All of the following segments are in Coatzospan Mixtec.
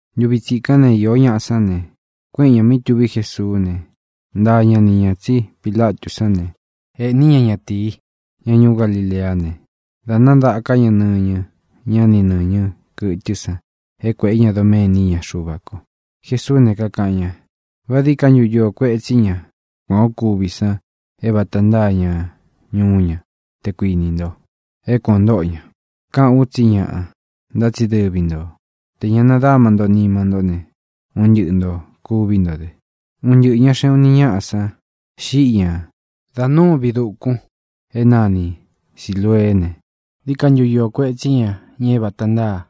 Ntuvi tsikán ne, iō ñá san ne, kuéꞌen ñā mí tuví Jesuú ne, ntaa ña ni ñā tsí Pilatú san ne, ēꞌní ña ña ñatīi, ña ñuú Galileá ne, da nádaká ña nɨñɨ ña ni nɨñɨ kɨtɨ́ san é kuēꞌé ña doméni íña Xuva ko. Jesuú ne, kakaꞌan ña: —¿Vá dií ka ntu iō kuetsí ña kuān o kúvi san é vata ntáa ña ñuú ña, te kuinī nto, é kuān o ntóꞌo ña? Kaꞌán u tsí ñaꞌa. Ntá tsi dɨvi nto, tē ña nadáma nto nima ntó ne, un ntɨꞌɨ ntō kuví nto dɨ. Un ntɨꞌɨ̄ ña xeꞌun uni ñáꞌa san xiꞌi ñá da núu viꞌi dūkun é nani Silūeé ne, ¿dií ka ntu iō kuetsí ña é vata ntáa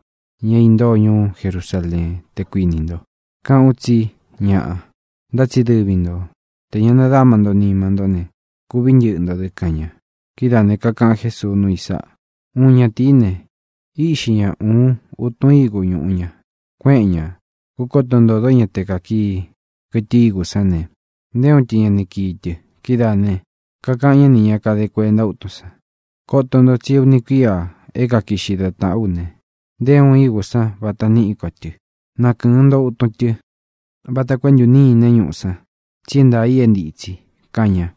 ña é īntóo ñuú Jerusaleén, te kuinī nto? Kaꞌán u tsí ñaꞌa. Ntá tsi dɨvi nto, tē ña nadáma nto nima ntó ne, kuví ntɨꞌɨ ntō dɨ —kaꞌan ña. Kidáā ne, kantáa Jesuu núu i sáꞌā: —Uun ñatīí ne, íꞌxi ña uun utun ígu ñuꞌu ña. Kuéꞌen ña kūkoto ntódo ña te kākii kɨtɨ ígū sán ne, nté uun tɨ ña kakii tɨ. Kidáā ne, kakaꞌan ñá nī ña kade kuenta útun san: “Koto nto tsi é uni kuíā é kakiꞌxi da tāꞌán u ne, nté uun igu sán vata níꞌi ko tɨ. Nakɨ̄ɨn nto utun tɨ vata koo é ntūnîné ñuꞌu san, tsi é ntaā i é ntitsi”, kaꞌan ña.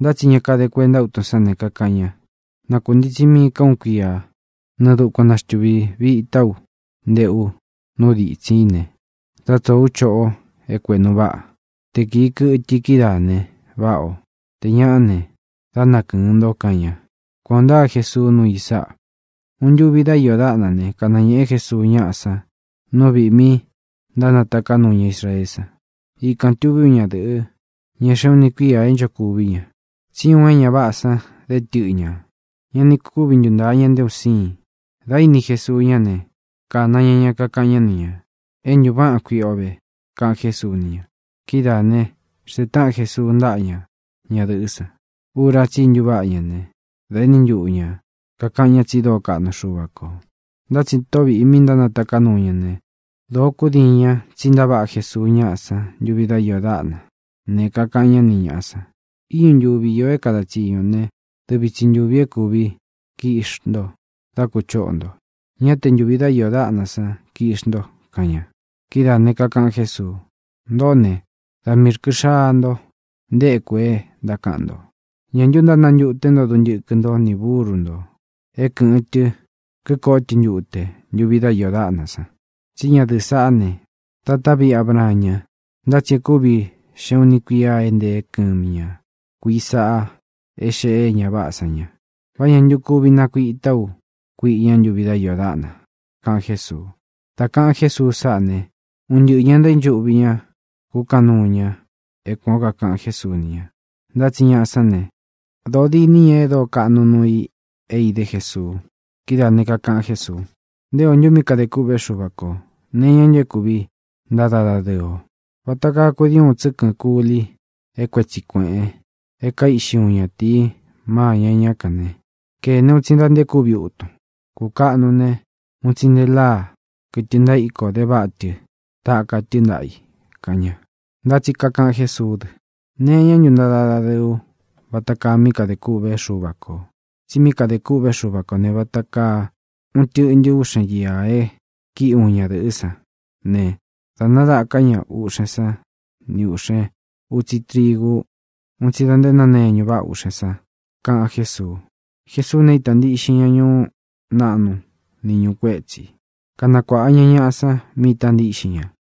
Ntá tsi ña kade kuenta útun sán ne, kakaꞌan ña: “Na kūntitsi mií ka uun kuiá, nɨɨ dukuan naxtīvitá u nteꞌu nú ditsín i ne, dá tsōo ú choꞌo é kuēꞌnu váꞌa. Te kīi kɨtɨ i kidáā ne, váꞌa ō. Tē ñaꞌá ne, dá nakɨ̄ɨn nto”, kaꞌan ña. —Kuan ō ntáa Jesuu nuu i sáꞌa. Uun ntuvi dá iō dáꞌnā ne, kanañēꞌe Jesuu ñáꞌa san nú viꞌī mí ntánataká nuu ña Israeé san. Ikān tuví uun ña dɨ̄ꞌɨ, e xéꞌun uni kuīa é nchokuví ña. Tsí uun é ña váꞌā san dé tɨꞌɨ ñā. Ña ni kúvi ntuntāa ña nté un síin. Dā íni Jesuu ñá ne, kāna ña ña, kakaꞌan ñá ni ñā: —É ntuváꞌan kuiꞌi o vé —kaꞌan Jésuu ni ña. Kidáā ne, xntee táꞌan Jesuu ntáꞌa ña ñadɨ̄ꞌɨ́ san. Ura tsí i ntuváꞌa ña ne, dā éni ntuꞌu ña kākaꞌan ña tsi dóo kaꞌnu Xuva kō. Ntá tsi tóꞌō viꞌi mí ntánataká nuu ña ne, dōo kúdiin ña tsí ntaváꞌa Jesuu ñáꞌa san ntuvi dá iō dáꞌna ne, kakaꞌan ñá ni ñāꞌa san: —Íñu ntuvi īo é kada tsiñu ō né, dɨvi tsi ntūvi é kūvi kiꞌxi nto dá kuchōꞌo nto; ñá te ntūvi dá iō dáꞌna san kiꞌxi nto —kaꞌan ña. Kidáā ne, kakaꞌan Jésuu: —Ntōꞌó ne, da miī rkɨ xaa nto nteku e ntákaꞌan nto. ¿Ñā ntu ntánantuté nto duntɨkɨ nto ni búru nto é kɨ̄ꞌɨn tɨ kikoꞌó tɨ ntute ntuvi dá iō dáꞌna san? Tsí ña dɨ̄ꞌɨ́ saꞌá ne, tatá viꞌi Abraan ña, ntá tsi é kūvi xeꞌun uni kuía e nteé kɨmi ña kuīꞌi sáꞌa é xēꞌé é ña váꞌā san ña. ¿Vá ñā ntu kuvi nakuitá u kuiꞌi ña ntuvi dá iō dáꞌna? —kaꞌan Jésuu. Dá kāꞌan Jésuu sáꞌā ne, un ntɨꞌɨ ñā ntaínchuꞌvi ña kúkaꞌan nuu ña é kuān ó kakaꞌan Jésuu ni ña. Ntá tsi ñaꞌa sán ne, dōó diní ña e dóo kaꞌnu nuu i é idé Jesuu. Kidáā ne, kakaꞌan Jésuu: —¿Nté ō ntu mí kadē kûꞌvé Xuva kō? ¿Nee iñá ntu é kuvi ntada dadɨɨ o? Vata kaa kudii uun tsɨ́kɨ̄n kuli é kuetsi kuēꞌen e kaíꞌxi uun ñatīi má iña ñá kān ne, kēne un tsi da nte kúvi utun. Kukaꞌnu ne, un tsi nte láa, kɨtɨ ntaíko, de váꞌa tɨ taka tɨ́ ntaꞌa i —kaꞌan ña. Ntá tsi kakaꞌan Jésuú dɨ: —¿Nee iñá ntu ntada dadɨɨ ú vata kaa mí kadē kûꞌvé Xuva kō? Tsi mí kadē kûꞌvé Xuva kō ne, vata kaa uun tɨꞌntɨ úꞌxen iā e kíꞌi uun ñadɨ̄ꞌɨ́ san ne, dā nadaka ña uꞌxen san ni uni xkúꞌve utsi trigu un tsi da nte náneñu váꞌa úꞌxen san —kaꞌan Jésuu. Jesuú ne, ítā ntíꞌxin ña ñuú naꞌnu ni ñūú kuetsi, kanakuāꞌa ña ñaꞌa san mí īta ntíꞌxin ña.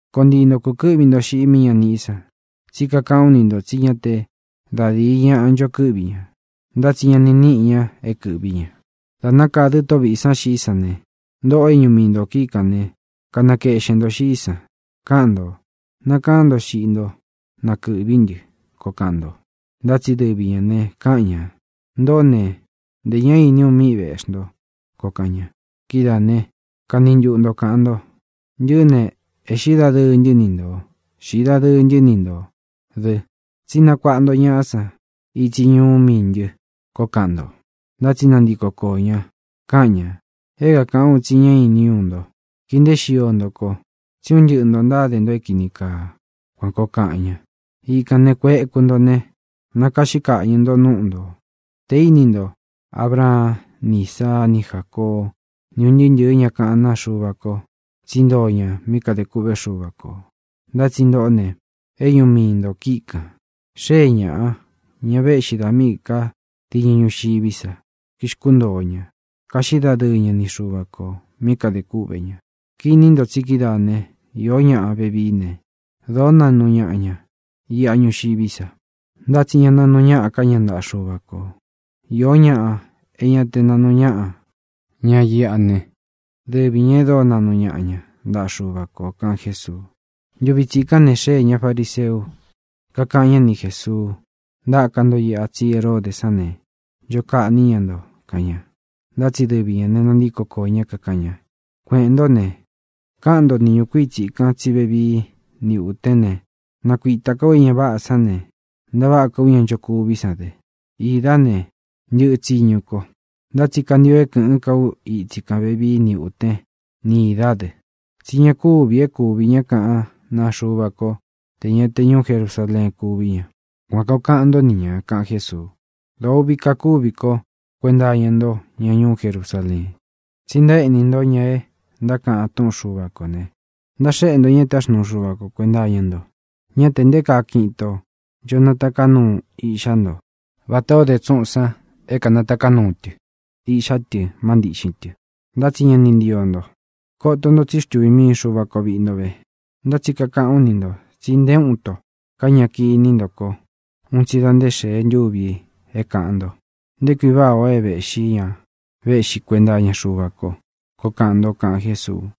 —Koó ntii nto kūkɨ́ꞌvi nto xiꞌi mí ña niꞌí san. Tsí kakaꞌán u ni ntō tsí ña te da díi ñaꞌa ncho kɨꞌví ña, ntá tsi ña níꞌi ña é kɨ̄ꞌví ña. Dā nákādɨ́ Tóꞌo vīꞌi san xiꞌi ñá ne, ntōꞌo é ñuꞌu mii nto kíꞌi kān né, nakeꞌxen ntō xiꞌí san, káꞌan ntō: “Nakaán nto xiꞌi nto, na kɨ̄ꞌví ntɨ”, koo kaꞌan nto. Ntá tsi dɨvi ñā ne, káꞌan ña: “Ntoꞌó ne, ntē ñá īní u mí vēꞌxí nto”, koo kaꞌan ña. Kidáā ne, kani ntuꞌu nto kāꞌan nto: “Ntɨꞌɨ́ ne, ēꞌxí dadɨɨ ntɨ́ ni ntō; xīꞌi dadɨɨ ntɨ́ ni ntō dɨ. Tsí nakuāꞌa nto ñaꞌa san itsi ñuú miī ntɨ”, koo kaꞌan nto. Ntá tsi nantiko kōo ñá, kaꞌan ña: “É kākaꞌán u tsi ñá īní u nto. Kii nteé xio nto ko, tsí un ntɨꞌɨ ntō ntáde nto é kīni kaa.” Kuan kōo kaꞌan ña. Ikān ne, kueku nto ne, nakaꞌxí kaꞌñɨ̄ nto núꞌu nto tē íni nto Abraan ni Ísaa ni Jácoó, ni ūn ntɨɨ́ ntɨ̄ɨ́ ña kaꞌán naa Xuva ko tsí ntoo ña mí kadē kûꞌvé Xuva kō. Ntá tsi ntoꞌó ne, é ñuꞌu mii ntō kíꞌi kān. Xée ñāꞌa, ñá vēꞌxí dā míꞌī ká diñɨ ñuxiví sa, kixkúntōo ña, kaꞌxí dadɨɨ ña ni Xuva kō mí kadē kúꞌvē ña. Kini nto tsi kidáa ne, īó ñaꞌa vevií ne, dōó naꞌnu ñaꞌa ña iꞌa ñuxiví sa, ntá tsi ña naꞌnu ñáꞌa ká ña ntaꞌa Xuva kō. Iō ñáꞌa é ña te naꞌnu ñáꞌa ña íꞌa ne, dɨvi ñā e dóo naꞌnu ñaꞌa ña ntaꞌa Xuva kō —kaꞌan Jésuu. Ntuvi tsikán ne, xéē ña fariseu, kakáꞌan ña ni Jēsuu: —Ntaka nto iꞌa, tsí Heródē sán ne, ncho kaꞌní ña nto —kaꞌan ña. Ntá tsi dɨvi ñā ne, nantíko koō ñá, kakaꞌan ña: —Kueꞌēn ntó ne, kaꞌan nto ni ñukuíi tsikan tsí vevií ni ūtén ne, nakuita ká u é ña váꞌā san ne, ntaváꞌa ká u ña nchokuví san dɨ. Īdá ne, ntɨ̄ꞌɨ tsiñu ko. Ntá tsi kantio é kɨ̄ꞌɨ́n ka ú itsi kān vevií ni ūtén ni īdá dɨ. Tsí ña kúvī é kūví ña kaꞌán naa Xuva ko tē ña te ñuú Jerusaleén kuví ña. Kuan kōo kaꞌan ntó ni nā —kaꞌan Jésuu—. ʼ¡Dōo uꞌvi kakúvi ko kuenta iña nto, ña ñuú Jerusaleen! ¡Tsi ntaéꞌní nto ña e ntákaꞌan túꞌun Xuva kō ne, ntáxéꞌe xuu nto ña é taxnuu Xuva ko kuēnta iña nto! ¡Ñá tē nté kaa kiꞌin itō ncho nataká nuu ú iꞌxá nto vatā ó de tsúꞌūn san é kānataká nuu tɨ iꞌxá tɨ má ntiꞌxin tɨ, ntá tsi ña ni ntío nto! Koto ntō tsí xtuvī mii Xuva ko viꞌi nto ve. Ntá tsi kakaꞌán u ni ntō tsi nté uun ito ká ña kīni ntó ko un tsi da nté tē xee ntúvi é kāꞌan nto: “¡Nté kui váꞌa ō é vēꞌxí ña véꞌxi kuenta iña Xuva ko!”, koo kaꞌan nto —kaꞌan Jésuu.